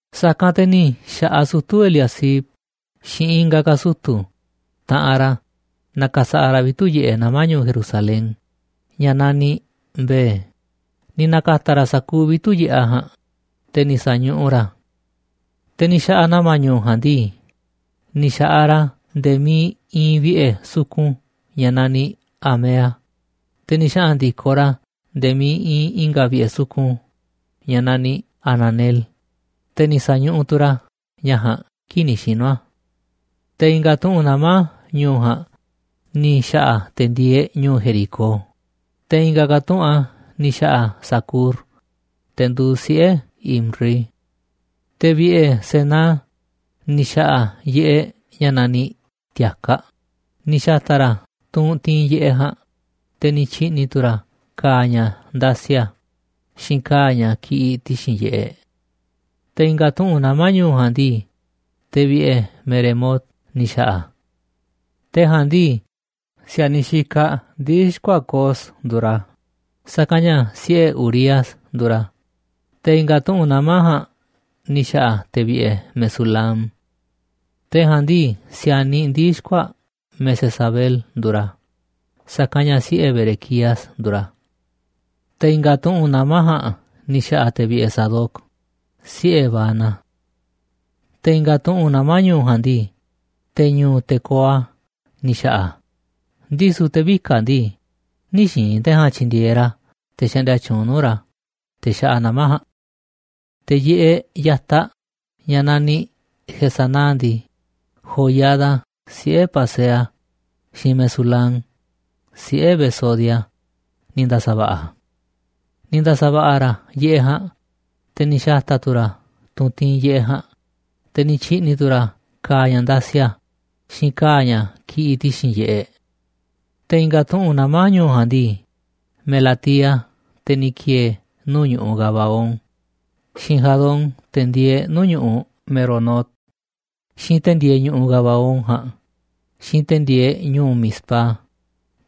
Sa̱kanꞌ te̱ ni̱ xa̱ꞌaꞌ sutu̱ Eliasib xiinꞌ i̱nga̱ ka̱ sutu̱, taꞌanꞌ ra̱, nakasaꞌa ra̱ vitu̱ꞌ yiꞌeꞌ nama̱ ñu̱u̱ Jerusalén ña̱ naniꞌ Mbe̱e̱. Ni̱ na̱ka̱ta̱ ra̱ sa̱kuuꞌ vitu̱ꞌ yiꞌeꞌ ja̱a̱nꞌ, te̱ ni̱ sa̱ñuꞌuꞌ ra̱ a̱. Te̱ ni̱ xa̱ꞌa̱ nama̱ ñu̱u̱ ja̱a̱nꞌ ndii, ni̱ xa̱ꞌaꞌ ra̱ nde̱e̱ miiꞌ iinꞌ vi̱ꞌe̱ sukun ña̱ naniꞌ Hamea, te̱ ni̱ xaꞌa̱n ndi̱koꞌ ra̱ ndee miiꞌ iinꞌ i̱nga̱ vi̱ꞌe̱ sukun, ña̱ naniꞌ Hananeel, te̱ ni̱ sa̱ñuꞌuꞌ tu̱ ra̱ ña̱ ja̱a̱nꞌ kii̱ꞌ ni̱ xinu̱ a̱. Te̱ i̱nga̱ tuꞌu̱nꞌ nama̱ ñu̱u̱ ja̱a̱nꞌ ni̱ xa̱ꞌa̱ te̱ ndieeꞌ ñu̱u̱ Jericó, te̱ i̱nga̱ ka̱ tuꞌu̱nꞌ a̱ ni̱ xa̱ꞌa̱ Zacur, te̱ nduuꞌ siꞌe̱ Imrí. Te̱ vi̱ꞌe̱ Senaa ni̱ xa̱ꞌa̱ yiꞌeꞌ ña̱ naniꞌ Ti̱a̱kaꞌ, ni̱ xa̱ta̱ ra̱ tunꞌ tiinꞌ yiꞌeꞌ ja̱a̱nꞌ, te̱ ni̱ tyi̱ꞌni̱ tu̱ ra̱ ka̱a̱ ña̱ ndasi a̱ xiinꞌ ka̱a̱ ña̱ kiꞌiꞌ ti̱xi̱n yiꞌeꞌ. Te̱ i̱nga̱ tuꞌu̱nꞌ nama̱ ñu̱u̱ ja̱a̱nꞌ ndii, te̱ vi̱ꞌe̱ Meremot ni̱ xa̱ꞌa̱ a̱. Te̱ ja̱a̱nꞌ ndii, si̱a̱niꞌ xikaꞌ ndii̱ xkuaa̱ꞌ Cos nduuꞌ ra̱, sa̱kanꞌ ña̱ siꞌe̱ Urías nduuꞌ ra̱. Te̱ i̱nga̱ tuꞌu̱nꞌ nama̱ ja̱a̱nꞌ ni̱ xa̱ꞌa̱ te̱ vi̱ꞌe̱ Mesulam. Te̱ ja̱a̱nꞌ ndii, si̱a̱niꞌ ndii̱ xkuaa̱ꞌ Mesezabeel nduuꞌ ra̱, sa̱kanꞌ ña̱ siꞌe̱ Berequías nduuꞌ ra̱. Te̱ i̱nga̱ tuꞌu̱nꞌ nama̱ ja̱a̱nꞌ ni̱ xa̱ꞌa̱ te̱ vi̱ꞌe̱ Sadoc, siꞌe̱ Baana. Te̱ i̱nga̱ tuꞌu̱nꞌ nama̱ ñu̱u̱ ja̱a̱nꞌ ndii, te̱ ñu̱u̱ Tecoa ni̱ xa̱ꞌa̱ a̱, ndisu̱ te̱ vika̱ꞌ ndii, nï̱ xi̱i̱n te̱ ja̱a̱nꞌ tyi̱ndi̱e̱eꞌ ra̱ te̱ xaꞌndia tyuunꞌ nuu̱ꞌ ra̱, te̱ xaꞌa nama̱ ja̱a̱nꞌ. Te̱ yiꞌeꞌ ya̱taꞌ ña̱ naniꞌ Jesaná ndii, Joiada, siꞌe̱ Paseah, xiinꞌ Mesulam, siꞌe̱ Besodías, ni̱ nda̱sa̱va̱ꞌa̱ a̱. Ni̱ nda̱sa̱va̱ꞌa̱ ra̱ yiꞌeꞌ ja̱a̱nꞌ, te̱ ni̱ xa̱ta̱ tu̱ ra̱ tunꞌ tiinꞌ yiꞌeꞌ ja̱a̱nꞌ, te̱ ni̱ tyi̱ꞌni̱ tu̱ ra̱ ka̱a̱ ña̱ ndasi a̱, xiinꞌ ka̱a̱ ña̱ kiꞌiꞌ ti̱xi̱n yiꞌeꞌ. Te̱ i̱nga̱ tuꞌu̱nꞌ nama̱ ñu̱u̱ ja̱a̱nꞌ ndii, Melatías, te̱ ni̱ ki̱e̱e̱ nuu̱ꞌ ñu̱ꞌuꞌ Gabaón, xiinꞌ Jadón, te̱ ndieeꞌ nuu̱ꞌ ñu̱ꞌuꞌ Meronot, xiinꞌ te̱ ndieeꞌ ñu̱ꞌuꞌ Gabaón ja̱a̱nꞌ, xiinꞌ te̱ ndieeꞌ ñu̱u̱ Mizpa.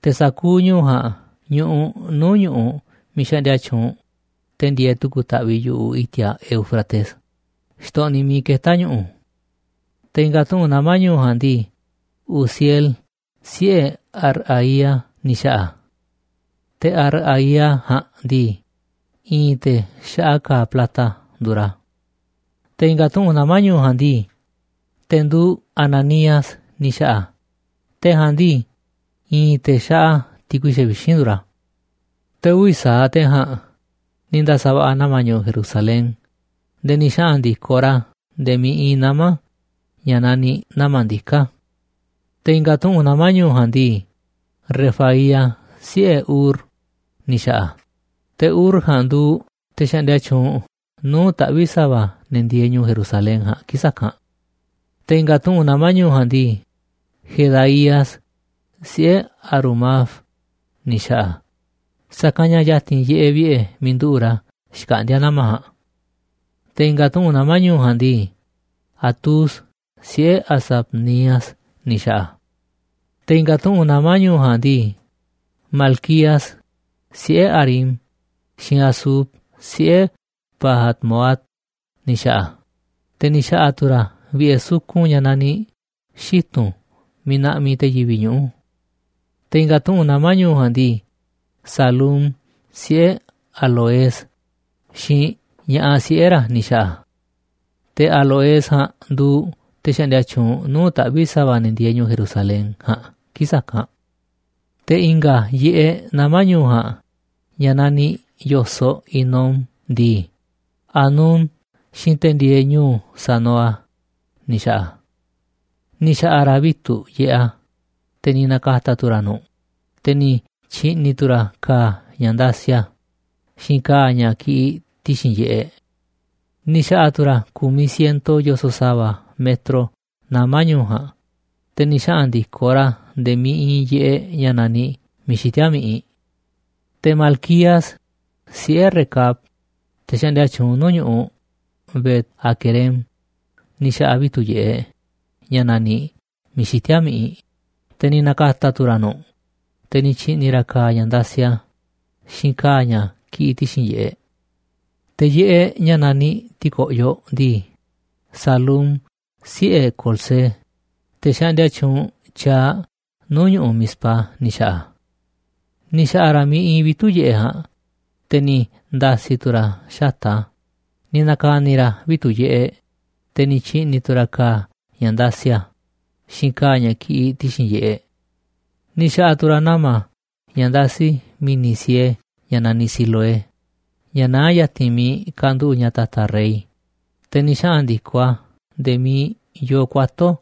Te̱ sa̱kuuꞌ ñu̱u̱ ja̱a̱nꞌ ñuꞌuꞌ nuu̱ꞌ ñu̱ꞌuꞌ miiꞌ xaꞌndia tyuunꞌ te̱ ndieeꞌ tu̱ku̱ taꞌviꞌ yu̱ꞌuꞌ i̱ti̱a̱ Éufrates, xtoꞌniꞌ miiꞌ ketá ñu̱ꞌu̱. Te̱ i̱nga̱ tuꞌu̱nꞌ nama̱ ñu̱u̱ ja̱a̱nꞌ ndii, Uziel, siꞌe̱ Harhaía, ni̱ xa̱ꞌa̱ a̱. Te̱ Harhaía ja̱a̱nꞌ ndii, i̱i̱n te̱ xaꞌa ka̱a̱ plata nduuꞌ ra̱. Te̱ i̱nga̱ tuꞌu̱nꞌ nama̱ ñu̱u̱ ja̱a̱nꞌ ndii, te̱ nduuꞌ Hananías ni̱ xa̱ꞌa̱ a̱, te̱ ja̱a̱nꞌ ndii, i̱i̱n te̱ xaꞌa ti̱kui xavixínꞌ nduuꞌ ra̱. Te̱ uvi̱ sa̱aꞌ te̱ ja̱a̱nꞌ ni̱ nda̱sa̱va̱ꞌa̱ nama̱ ñu̱u̱ Jerusalén nde̱e̱ ni̱ xaꞌa̱n ndi̱koꞌ ra̱ nde̱e̱ miiꞌ iinꞌ nama̱ ña̱ naniꞌ Nama̱ Ndiká. Te̱ i̱nga̱ tuꞌu̱nꞌ nama̱ ñu̱u̱ ja̱a̱nꞌ ndii, Refaías, siꞌe̱ Hur, ni̱ xa̱ꞌa̱ a̱, te̱ Hur ja̱a̱nꞌ nduuꞌ te̱ xaꞌndia tyuunꞌ nuu̱ꞌ taꞌvi̱ꞌ sa̱va̱ ne̱ ndieeꞌ ñu̱u̱ Jerusalén ja̱a̱nꞌ kii̱ꞌ sa̱kanꞌ. Te̱ i̱nga̱ tuꞌu̱nꞌ nama̱ ñu̱u̱ ja̱a̱nꞌ ndii, Jedaías, siꞌe̱ Harumaf, ni̱ xa̱ꞌa̱ a̱, sa̱kanꞌ ña̱ ya̱ti̱n yiꞌeꞌ vi̱ꞌe̱ miiꞌ nduꞌu̱ꞌ ra̱ xkaꞌndíá nama̱ ja̱a̱nꞌ. Te̱ i̱nga̱ tuꞌu̱nꞌ nama̱ ñu̱u̱ ja̱a̱nꞌ ndii, Hatús, siꞌe̱ Hasabnías, ni̱ xa̱ꞌa̱ a̱. Te̱ i̱nga̱ tuꞌu̱nꞌ nama̱ ñu̱u̱ ja̱a̱nꞌ ndii, Malquías, siꞌe̱ Harim xiinꞌ Hasub, siꞌe̱ Pahat-moab, ni̱ xa̱ꞌa̱ a̱, te̱ ni̱ xa̱ꞌa̱ tu̱ ra̱ vi̱ꞌe̱ sukun ña̱ naniꞌ Xitu̱n Miiꞌ Naꞌmiꞌ Te̱ Yivi̱ꞌ Ñuꞌu̱. Te̱ i̱nga̱ tuꞌu̱nꞌ nama̱ ñu̱u̱ ja̱a̱nꞌ ndii, Salum, siꞌe̱ Halohes, xiinꞌ ña̱ꞌaꞌ siꞌe̱ ra̱ ni̱ xa̱ꞌa̱ a̱. Te̱ Halohes ja̱a̱nꞌ nduuꞌ te̱ xaꞌndia tyuunꞌ nuu̱ꞌ taꞌvi̱ꞌ sa̱va̱ ne̱ ndieeꞌ ñu̱u̱ Jerusalén ja̱a̱nꞌ kii̱ꞌ sa̱kanꞌ. Te̱ i̱nga̱ yiꞌeꞌ nama̱ ñu̱u̱ ja̱a̱nꞌ, ña̱ naniꞌ Yo̱soꞌ Hinóm ndii, Hanún xiinꞌ te̱ ndieeꞌ ñu̱u̱ Zanoa ni̱ xa̱ꞌa̱ a̱. Ni̱ xa̱ꞌa̱ ra̱ vitu̱ꞌ yiꞌeꞌ a̱, te̱ ni̱ na̱ka̱ta̱ tu̱ ra̱ nu̱ꞌ, te̱ ni̱ tyi̱ꞌni̱ tu̱ ra̱ ka̱a̱ ña̱ ndasi a̱ xiinꞌ ka̱a̱ ña̱ kiꞌiꞌ ti̱xi̱n yiꞌeꞌ. Ni̱ xa̱ꞌa̱ tu̱ ra̱ ku̱miꞌ siento yoso̱ꞌ sa̱va̱ metro nama̱ ñu̱u̱ ja̱a̱nꞌ, te̱ ni̱ xaꞌa̱n ndi̱koꞌ ra̱ nde̱e̱ miiꞌ iinꞌ yiꞌeꞌ ña̱ naniꞌ miiꞌ xitíá mi̱ꞌiꞌ. Te̱ Malquías, siꞌe̱ Recab, te̱ xaꞌndia tyuunꞌ nuu̱ꞌ ñu̱ꞌuꞌ Bet-haquerem, ni̱ xa̱ꞌa̱ vitu̱ꞌ yiꞌeꞌ ña̱ naniꞌ Miiꞌ Xitíá Mi̱ꞌiꞌ, te̱ ni̱ na̱ka̱ta̱ tu̱ ra̱ nu̱ꞌ, te̱ ni̱ tyi̱ꞌni̱ ra̱ ka̱a̱ ña̱ ndasi a̱ xiinꞌ ka̱a̱ ña̱ kiꞌiꞌ ti̱xi̱n yiꞌeꞌ. Te̱ yiꞌeꞌ ña̱ naniꞌ Ti̱ko̱ꞌyoꞌ ndii, Salum, siꞌe̱ Col-hoze, te̱ xaꞌndia tyuunꞌ tyaaꞌ nuu̱ꞌ ñu̱ꞌuꞌ Mizpa, ni̱ xa̱ꞌa̱ a̱. Ni̱ xa̱ꞌa̱ ra̱ miiꞌ iinꞌ vitu̱ꞌ yiꞌeꞌ ja̱a̱nꞌ, te̱ ni̱ nda̱si̱ tu̱ ra̱ xata̱ꞌ a̱, ni̱ na̱ka̱ni̱ ra̱ vitu̱ꞌ yiꞌeꞌ, te̱ ni̱ tyi̱ꞌni̱ tu̱ ra̱ ka̱a̱ ña̱ ndasi a̱ xiinꞌ ka̱a̱ ña̱ kiꞌiꞌ ti̱xi̱n yiꞌeꞌ. Ni̱ xa̱ꞌa̱ tu̱ ra̱ nama̱ ña̱ ndasi mi̱ni̱ siee ña̱ naniꞌ Siloé ña̱ naá ya̱ti̱n miiꞌ kanduꞌu̱ꞌ ña̱ ta̱ta̱ rey, te̱ ni̱ xaꞌa̱n ndi̱koꞌ a̱ nde̱e̱ miiꞌ yoo kuato̱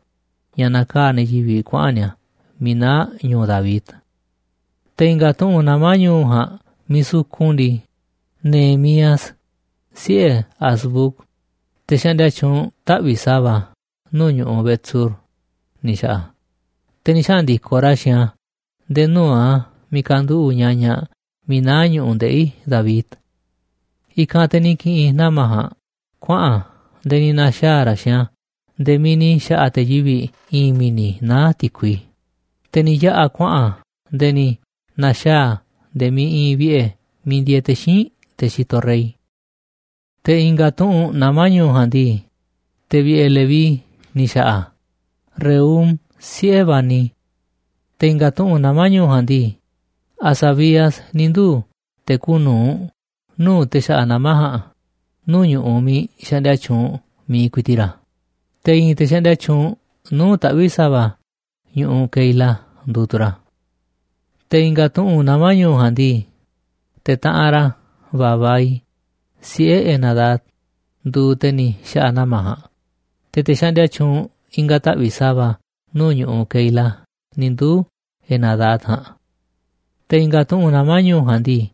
ña̱ na̱kaa̱ꞌ ne̱ yivi̱ꞌ kuaꞌa̱n ni̱a̱ miiꞌ naá ñu̱u̱ David. Te̱ i̱nga̱ tuꞌu̱nꞌ nama̱ ñu̱u̱ ja̱a̱nꞌ miiꞌ sukun ndii, Nehemías, siꞌe̱ Azbuc, te̱ xaꞌndia tyuunꞌ taꞌvi̱ꞌ sa̱va̱ nuu̱ꞌ ñu̱ꞌuꞌ Bet-sur, ni̱ xa̱ꞌa̱ a̱. Te̱ ni̱ xaꞌa̱n ndi̱koꞌ ra̱ xiinꞌ a̱ nde̱e̱ nuu̱ꞌ a̱ miiꞌ kanduꞌu̱ꞌ ñañaꞌ miiꞌ naá ñu̱ꞌuꞌ ndeꞌi̱ David. I̱kanꞌ te̱ ni̱ ki̱ꞌi̱n nama̱ ja̱a̱nꞌ kuaꞌa̱n a̱ nde̱e̱ ni̱ na̱xaa̱ ra̱ xiinꞌ a̱ nde̱e̱ miiꞌ ni̱ xa̱ꞌa̱ te̱ yivi̱ꞌ i̱i̱n mi̱ni̱ naá ti̱kui, te̱ ni̱ yaꞌa̱ a̱ kuaꞌa̱n a̱ nde̱e̱ ni̱ na̱xaa̱ a̱ nde̱e̱ miiꞌ iinꞌ vi̱ꞌe̱ miiꞌ ndieeꞌ te̱ xíinꞌ, te̱ ndi̱eni, te̱ xitoꞌ rey. Te̱ i̱nga̱ tuꞌu̱nꞌ nama̱ ñu̱u̱ ja̱a̱nꞌ ndii, te̱ vi̱ꞌe̱ Leví ni̱ xa̱ꞌa̱ a̱, Rehum, siꞌe̱ Bani. Te̱ i̱nga̱ tuꞌu̱nꞌ nama̱ ñu̱u̱ ja̱a̱nꞌ ndii, Hasabías ni̱ nduu̱ te̱ kuuꞌ nu̱uꞌ nuu̱ꞌ te̱ xaꞌa nama̱ ja̱a̱nꞌ nuu̱ꞌ ñu̱ꞌuꞌ miiꞌ xaꞌndia tyuunꞌ mi̱iꞌ ku̱i̱ti̱ꞌ ra̱, te̱ i̱i̱n te̱ xaꞌndia tyuunꞌ nuu̱ꞌ taꞌvi̱ꞌ sa̱va̱ ñu̱ꞌuꞌ Keila nduuꞌ tu̱ ra̱. Te̱ i̱nga̱ tuꞌu̱nꞌ nama̱ ñu̱u̱ ja̱a̱nꞌ ndii, te̱ taꞌanꞌ ra̱ Bavai, siꞌe̱ Henadad, nduuꞌ te̱ ni̱ xa̱ꞌa̱ nama̱ ja̱a̱nꞌ, te̱ te̱ xaꞌndia tyuunꞌ i̱nga̱ taꞌvi̱ꞌ sa̱va̱ nuu̱ꞌ ñu̱ꞌuꞌ Keila ni̱ nduu̱ Henadad ja̱a̱nꞌ. Te̱ i̱nga̱ tuꞌu̱nꞌ nama̱ ñu̱u̱ ja̱a̱nꞌ ndii,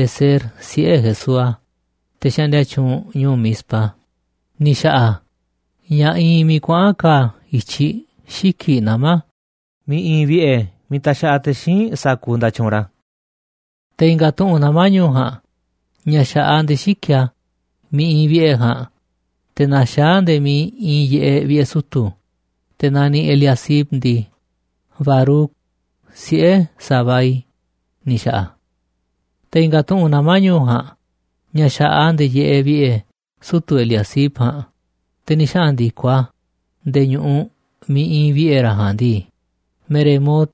Ezer, siꞌe̱ Jesúa, te̱ xaꞌndia tyuunꞌ ñu̱u̱ Mizpa, ni̱ xa̱ꞌa̱ a̱ ña̱ iinꞌ miiꞌ kuaꞌa̱n ka̱a̱ i̱tyiꞌ xiki̱ꞌ nama̱ miiꞌ iinꞌ vi̱ꞌe̱ miiꞌ taxaꞌa te̱ xíinꞌ sa̱kuuꞌ nda̱tyuunꞌ ra̱. Te̱ i̱nga̱ tuꞌu̱nꞌ nama̱ ñu̱u̱ ja̱a̱nꞌ, ña̱ xa̱ꞌaꞌ a̱ nde̱e̱ xiki̱ꞌ a̱ miiꞌ iinꞌ vi̱ꞌe̱ ja̱a̱nꞌ te̱ naxaá a̱ nde̱e̱ miiꞌ iinꞌ yiꞌeꞌ vi̱ꞌe̱ sutu̱, te̱ naniꞌ Eliasib ndii, Baruc, siꞌe̱ Zabai, ni̱ xa̱ꞌa̱ a̱. Te̱ i̱nga̱ tuꞌu̱nꞌ nama̱ ñu̱u̱ ja̱a̱nꞌ ña̱ xa̱ꞌaꞌ a̱ nde̱e̱ yiꞌeꞌ vi̱ꞌe̱ sutu̱ Eliasib ja̱a̱nꞌ, te̱ ni̱ xaꞌa̱n ndi̱koꞌ a̱ nde̱e̱ ñu̱ꞌuꞌ miiꞌ iinꞌ vi̱ꞌe̱ ra̱ ja̱a̱nꞌ ndii, Meremot,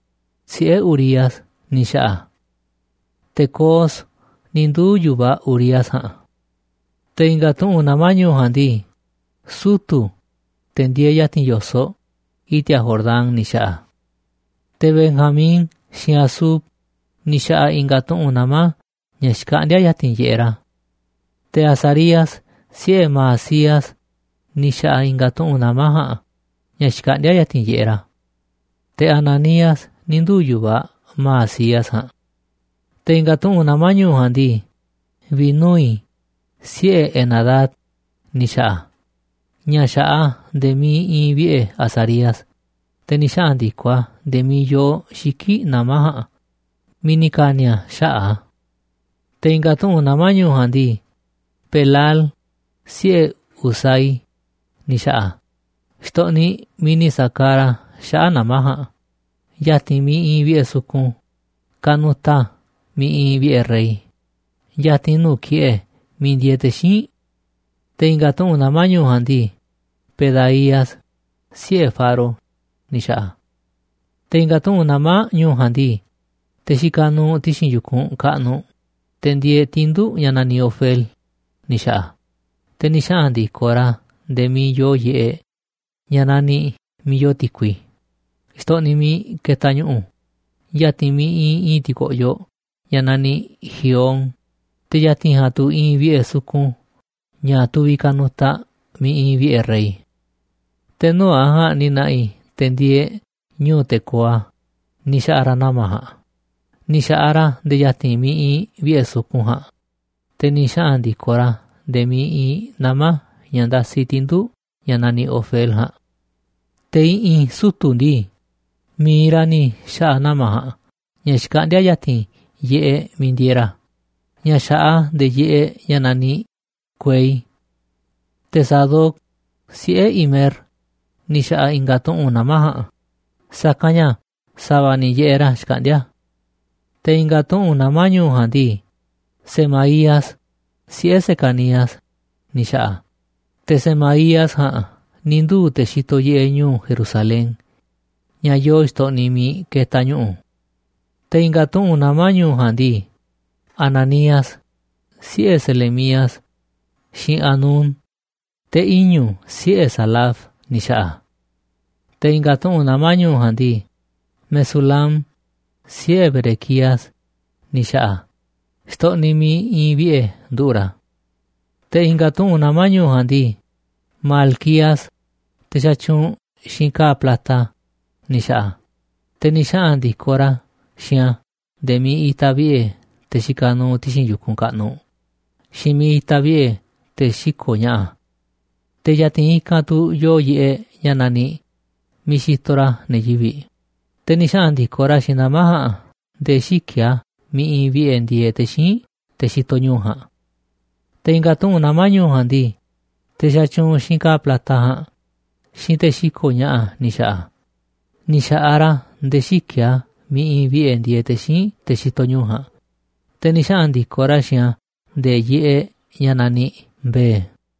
siꞌe̱ Urías, ni̱ xa̱ꞌa̱ a̱. Te̱ Cos ni̱ nduu̱ yu̱vaꞌ Urías ja̱a̱nꞌ. Te̱ i̱nga̱ tuꞌu̱nꞌ nama̱ ñu̱u̱ ja̱a̱nꞌ ndii, sutu̱, te̱ ndieeꞌ ya̱ti̱n yo̱soꞌ i̱ti̱a̱ Jordán, ni̱ xa̱ꞌa̱ a̱. Te̱ Benjamín xiinꞌ Hasub ni̱ xa̱ꞌa̱ i̱nga̱ tuꞌu̱nꞌ nama̱ ña̱ xkaꞌndíá ya̱ti̱n yiꞌeꞌ ra̱. Te̱ Azarías, siꞌe̱ Maasías, ni̱ xa̱ꞌa̱ i̱nga̱ tuꞌu̱nꞌ nama̱ ja̱a̱nꞌ ña̱ xkaꞌndíá ya̱ti̱n yiꞌeꞌ ra̱. Te̱ Ananías ni̱ nduu̱ yu̱vaꞌ Maasías ja̱a̱nꞌ. Te̱ i̱nga̱ tuꞌu̱nꞌ nama̱ ñu̱u̱ ja̱a̱nꞌ ndii, Binúi, siꞌe̱ Henadad, ni̱ xa̱ꞌa̱ a̱ ña̱ xa̱ꞌaꞌ a̱ nde̱e̱ miiꞌ iinꞌ vi̱ꞌe̱ Azarías, te̱ ni̱ xaꞌa̱n ndi̱koꞌ a̱ nde̱e̱ miiꞌ yoo xiki̱ꞌ nama̱ ja̱a̱nꞌ, miiꞌ ni̱ ka̱ni̱a̱ xaꞌa̱ꞌ a̱. Te̱ i̱nga̱ tuꞌu̱nꞌ nama̱ ñu̱u̱ ja̱a̱nꞌ ndii, Pelal, siꞌe̱ Uzai, ni̱ xa̱ꞌa̱ a̱, xtoꞌniꞌ miiꞌ ni̱ sa̱kaaꞌ ra̱ xaꞌa̱ꞌ nama̱ ja̱a̱nꞌ ya̱ti̱n miiꞌ iinꞌ vi̱ꞌe̱ sukun, kanutaꞌ a̱ miiꞌ iinꞌ vi̱ꞌe̱ rey, ya̱ti̱n nuu̱ꞌ ki̱ꞌe̱ miiꞌ ndieeꞌ te̱ xíinꞌ. Te̱ i̱nga̱ tuꞌu̱nꞌ nama̱ ñu̱u̱ ja̱a̱nꞌ ndii, Pedaías, siꞌe̱ Faros, ni̱ xa̱ꞌa̱ a̱. Te̱ i̱nga̱ tuꞌu̱nꞌ nama̱ ñu̱u̱ ja̱a̱nꞌ ndii, te̱ xikaꞌ nuuꞌ ti̱xi̱n yu̱kunꞌ kaꞌnuꞌ, te̱ ndieeꞌ tindu̱ꞌ ña̱ naniꞌ Ofel ni̱ xa̱ꞌa̱ a̱, te̱ ni̱ xaꞌa̱n ndi̱koꞌ ra̱ nde̱e̱ miiꞌ yoo yiꞌeꞌ, ña̱ naniꞌ Miiꞌ Yooꞌ Ti̱kui, xtoꞌniꞌ miiꞌ ketaꞌ ñu̱ꞌu̱, ya̱ti̱n miiꞌ iinꞌ i̱i̱n ti̱ko̱ꞌyoꞌ ña̱ naniꞌ Gihon, te̱ ya̱ti̱n ja̱a̱nꞌ tu̱ iinꞌ vi̱ꞌe̱ sukun ña̱ tuviꞌ kanutaꞌ miiꞌ iinꞌ vi̱ꞌe̱ rey. Te̱ nuu̱ꞌ a̱ ja̱a̱nꞌ ni̱ na̱ꞌi̱ te̱ ndieeꞌ ñu̱u̱ Tecoa ni̱ xa̱ꞌa̱ ra̱ nama̱ ja̱a̱nꞌ, ni̱ xa̱ꞌaꞌ ra̱ nde̱e̱ ya̱ti̱n miiꞌ iinꞌ vi̱ꞌe̱ sukun ja̱a̱nꞌ, te̱ ni̱ xaꞌa̱n ndi̱koꞌ ra̱ nde̱e̱ miiꞌ iinꞌ nama̱ ña̱ ndasi tindu̱ꞌ ña̱ naniꞌ Ofel ja̱a̱nꞌ. Te̱ i̱ꞌi̱n sutu̱ ndii, mi̱iꞌ ra̱ ni̱ xa̱ꞌa̱ nama̱ ja̱a̱nꞌ ña̱ xkaꞌndíá ya̱ti̱n yiꞌeꞌ miiꞌ ndieeꞌ ra̱, ña̱ xa̱ꞌaꞌ a̱ nde̱e̱ yiꞌeꞌ ña̱ naniꞌ Kuei. Te̱ Sadoc, siꞌe̱ Imer, ni̱ xa̱ꞌa̱ i̱nga̱ tuꞌu̱nꞌ nama̱ ja̱a̱nꞌ, sa̱kanꞌ ña̱ sa̱va̱ ni̱ yiꞌeꞌ ra̱ xkaꞌndíá a̱. Te̱ i̱nga̱ tuꞌu̱nꞌ nama̱ ñu̱u̱ ja̱a̱nꞌ ndii, Semaías, siꞌe̱ Secanías, ni̱ xa̱ꞌa̱ a̱, te̱ Semaías ja̱a̱nꞌ ni̱ nduu̱ te̱ xitoꞌ yiꞌeꞌ ñu̱u̱ Jerusalén, ña̱ yoo xtoꞌniꞌ miiꞌ ketaꞌ ñu̱ꞌu̱. Te̱ i̱nga̱ tuꞌu̱nꞌ nama̱ ñu̱u̱ ja̱a̱nꞌ ndii, Hananías, siꞌe̱ Selemías xiinꞌ Hanún, te̱ iñu̱ siꞌe̱ Salaf, ni̱ xa̱ꞌa̱ a̱. Te̱ i̱nga̱ tuꞌu̱nꞌ nama̱ ñu̱u̱ ja̱a̱nꞌ ndii, Mesulam, siꞌe̱ Berequías, ni̱ xa̱ꞌa̱ a̱, xtoꞌniꞌ miiꞌ iinꞌ vi̱ꞌe̱ nduꞌu̱ꞌ ra̱. Te̱ i̱nga̱ tuꞌu̱nꞌ nama̱ ñu̱u̱ ja̱a̱nꞌ ndii, Malquías, te̱ xatyuunꞌ xiinꞌ ka̱a̱ plata, ni̱ xa̱ꞌa̱ a̱, te̱ ni̱ xaꞌa̱n ndi̱koꞌ ra̱ xiinꞌ a̱ nde̱e̱ miiꞌ itaꞌ vi̱ꞌe̱ te̱ xikaꞌ nuuꞌ ti̱xi̱n yu̱kunꞌ kaꞌnuꞌ, xiinꞌ miiꞌ itaꞌ vi̱ꞌe̱ te̱ xiko̱ꞌ ña̱ꞌa̱. Te̱ ya̱ti̱n i̱kanꞌ tu̱ yoo yiꞌeꞌ ña̱ naniꞌ Miiꞌ Xitoꞌ Ra̱ Ne̱ Yivi̱ꞌ, te̱ ni̱ xaꞌa̱n ndi̱koꞌ ra̱ xiinꞌ nama̱ ja̱a̱nꞌ nde̱e̱ xiki̱ꞌ a̱ miiꞌ iinꞌ vi̱ꞌe̱ ndieeꞌ te̱ xíinꞌ, te̱ xitoꞌ ñu̱u̱ ja̱a̱nꞌ. Te̱ i̱nga̱ tuꞌu̱nꞌ nama̱ ñu̱u̱ ja̱a̱nꞌ ndii, te̱ xatyuunꞌ xiinꞌ ka̱a̱ plata ja̱a̱nꞌ xiinꞌ te̱ xiko̱ꞌ ña̱ꞌa̱ ni̱ xa̱ꞌa̱ a̱. Ni̱ xa̱ꞌaꞌ ra̱ nde̱e̱ xiki̱ꞌ a̱ miiꞌ iinꞌ vi̱ꞌe̱ ndieeꞌ te̱ xíinꞌ te̱ xitoꞌ ñu̱u̱ ja̱a̱nꞌ, te̱ ni̱ xaꞌa̱n ndi̱koꞌ ra̱ xiinꞌ a̱ nde̱e̱ yiꞌeꞌ ña̱ naniꞌ Mbe̱e̱.